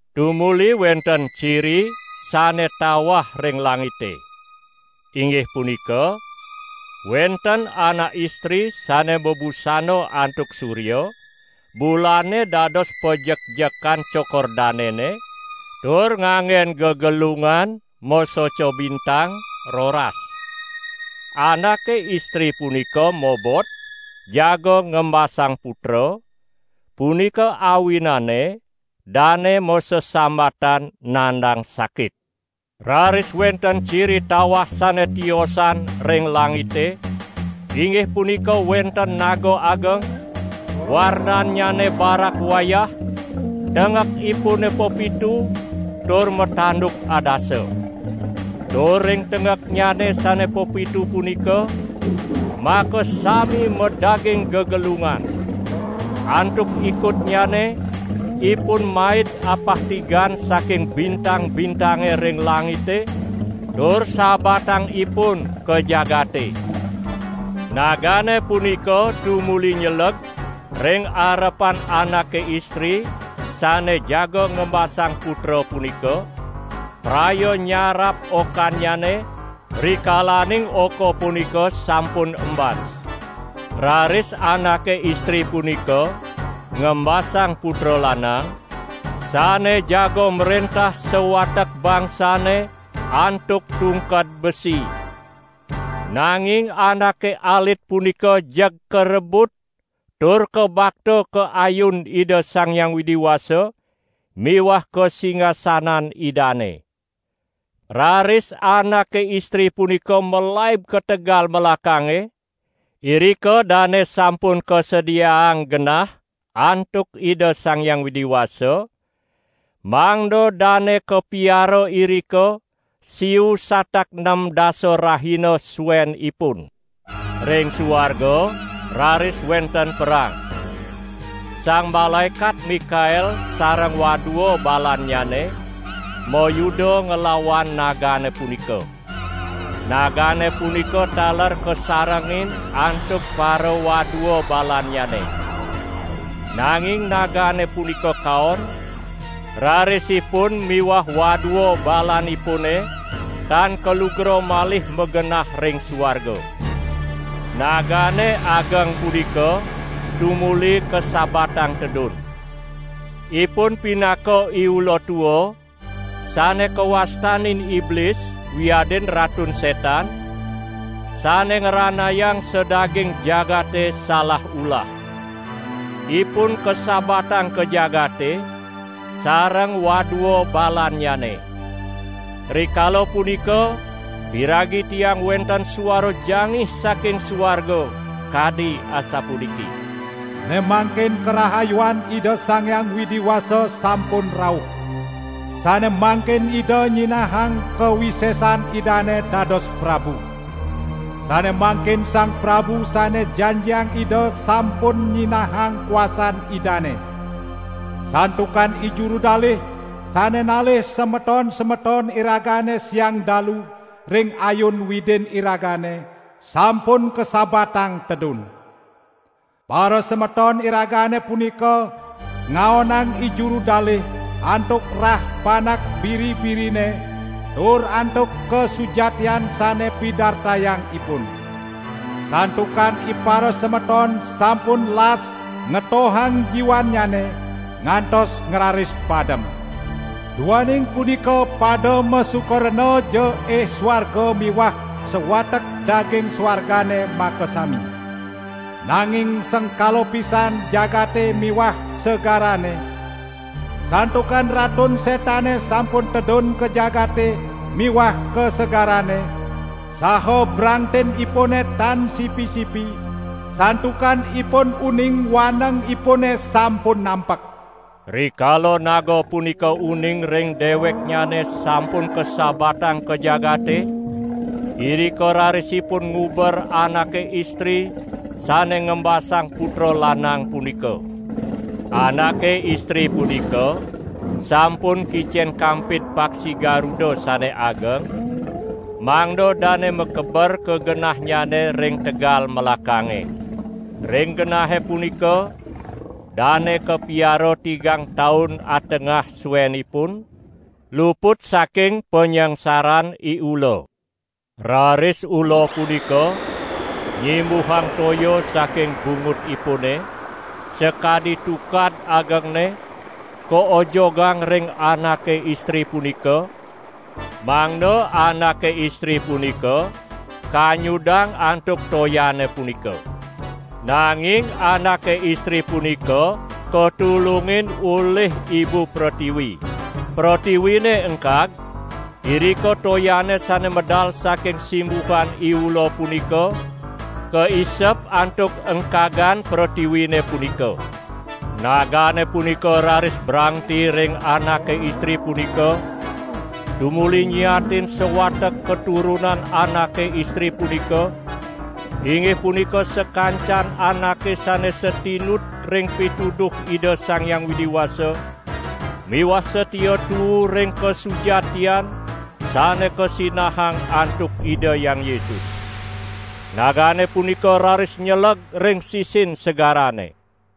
Tumuli wenten ciri sane tawah ring langite. Inggih punika, wenten anak istri sane mabusana antuk surya, bulane dados pajekjekan cokor danene, tur nganggen gegelungan masoca bintang roras. Anake istri punika mobot jaga ngembasang putra, punika awinane dane masesambatan nandang sakit. Raris wenten ciri tawah sane tiosan ring langite, inggih punika wenten naga ageng, warnannyane barak wayah, tenggekipune pepitu tur matanduk adasa. Tur ring tenggeknyane sane pepitu punika, makasami madaging gegelungan. Antuk ikutnyane, ipun maid apah tigan saking bintang-bintange ring langite tur sabatang ipun ka jagate. Nagane punika tumuli nyeleg ring arepan anake istri sane jaga ngembasang putra punika, praya nyarap okannyane, rikalaning oka punika sampun embas. Raris anake istri punika ngembasang putra lanang, sane jaga mrentah sawatek bangsane antuk tungked besi. Nanging anake alit punika jeg karebut tur kabakta ka ayun Ida Sang Hyang Widi Wasa miwah ka singasanan Idane. Raris anake istri punika malaib ka tegal melakange, irika dane sampun kasediaang genah antuk Ida Sang Hyang Widi Wasa, mangda dane kapiara irika siu satak nem dasa rahina suenipun. Ring suarga raris wenten perang. Sang Malaekat Mikael sareng wadua balannyane mayuda nglawan nagane punika. Nagane punika taler kasarengin antuk parawadua balannyane. Nanging nagane punika kaon, raris ipun miwah wadua balanipune tan kalugra malih magenah ring suarga. Nagane ageng punika tumuli kasabatang tedun. Ipun pinaka iula tua, sane kawastanin Iblis wiadin Ratun Setan, sane ngranayang sadaging jagate salah ulah. Ipun kasabatang ka jagate, sareng wadua balannyane. Rikala punika piragi tiang wenten suara jangih saking suarga kadi asapuniki: "Ne mangkin karahayuan Ida Sang Hyang Widi Wasa sampun rauh. Sane mangkin Ida nyinahang kawisesan Idane dados prabu. Sane mangkin Sang Prabu sane janjiang Ida sampun nyinahang kuasan Idane. Santukan ijuru dalih sane nalih semeton-semeton iragane siang dalu ring ayun Widin iragane, sampun kasabatang tedun. Parasemeton iragane punika ngaonang ijuru dalih antuk rah Panak Biri-birine tur antuk kasujatian sane pidartayang ipun. Santukan iparasemeton sampun las ngetohang jiwannyane, ngantos ngraris padem. Duaning punika pada masuka renaja ih suarga miwah sawatek daging suargane makasami. Nanging sengkala pisan jagate miwah segarane. Santukan Ratun Setane sampun tedun ka jagate miwah ka segarane, saha brangtinipune tan sipi-sipi, santukan ipun uning wanengipune sampun nampek." Rikala naga punika uning ring deweknyane sampun kasabatang ka jagate, irika raris ipun nguber anake istri sane ngembasang putra lanang punika. Anake istri punika sampun kicen kampid paksi garuda sane ageng, mangda dane makeber ka genahnyane ring tegal melakange. Ring genahe punika dane kapiara tigang taun atengah suenipun, luput saking panyangsaran iula. Raris ula punika nyimbuhang toya saking bungutipune, sakadi tukad agengne, kaojogang ring anake istri punika, mangda anake istri punika kanyudang antuk toyane punika. Nanging anake istri punika katulungin olih ibu pretiwi. Pretiwine engkag, irika toyane sane medal saking simbuhan iula punika kaisep antuk engkagan pretiwine punika. Nagane punika raris brangti ring anake istri punika, tumuli nyiatin sawatek katurunan anake istri punika, inggih punika sakancan anake sane satinut ring pituduh Ida Sang Hyang Widi Wasa miwah satia tuu ring kasujatian sane kasinahang antuk Ida Hyang Yesus. Nagane punika raris nyeleg ring sisin segarane.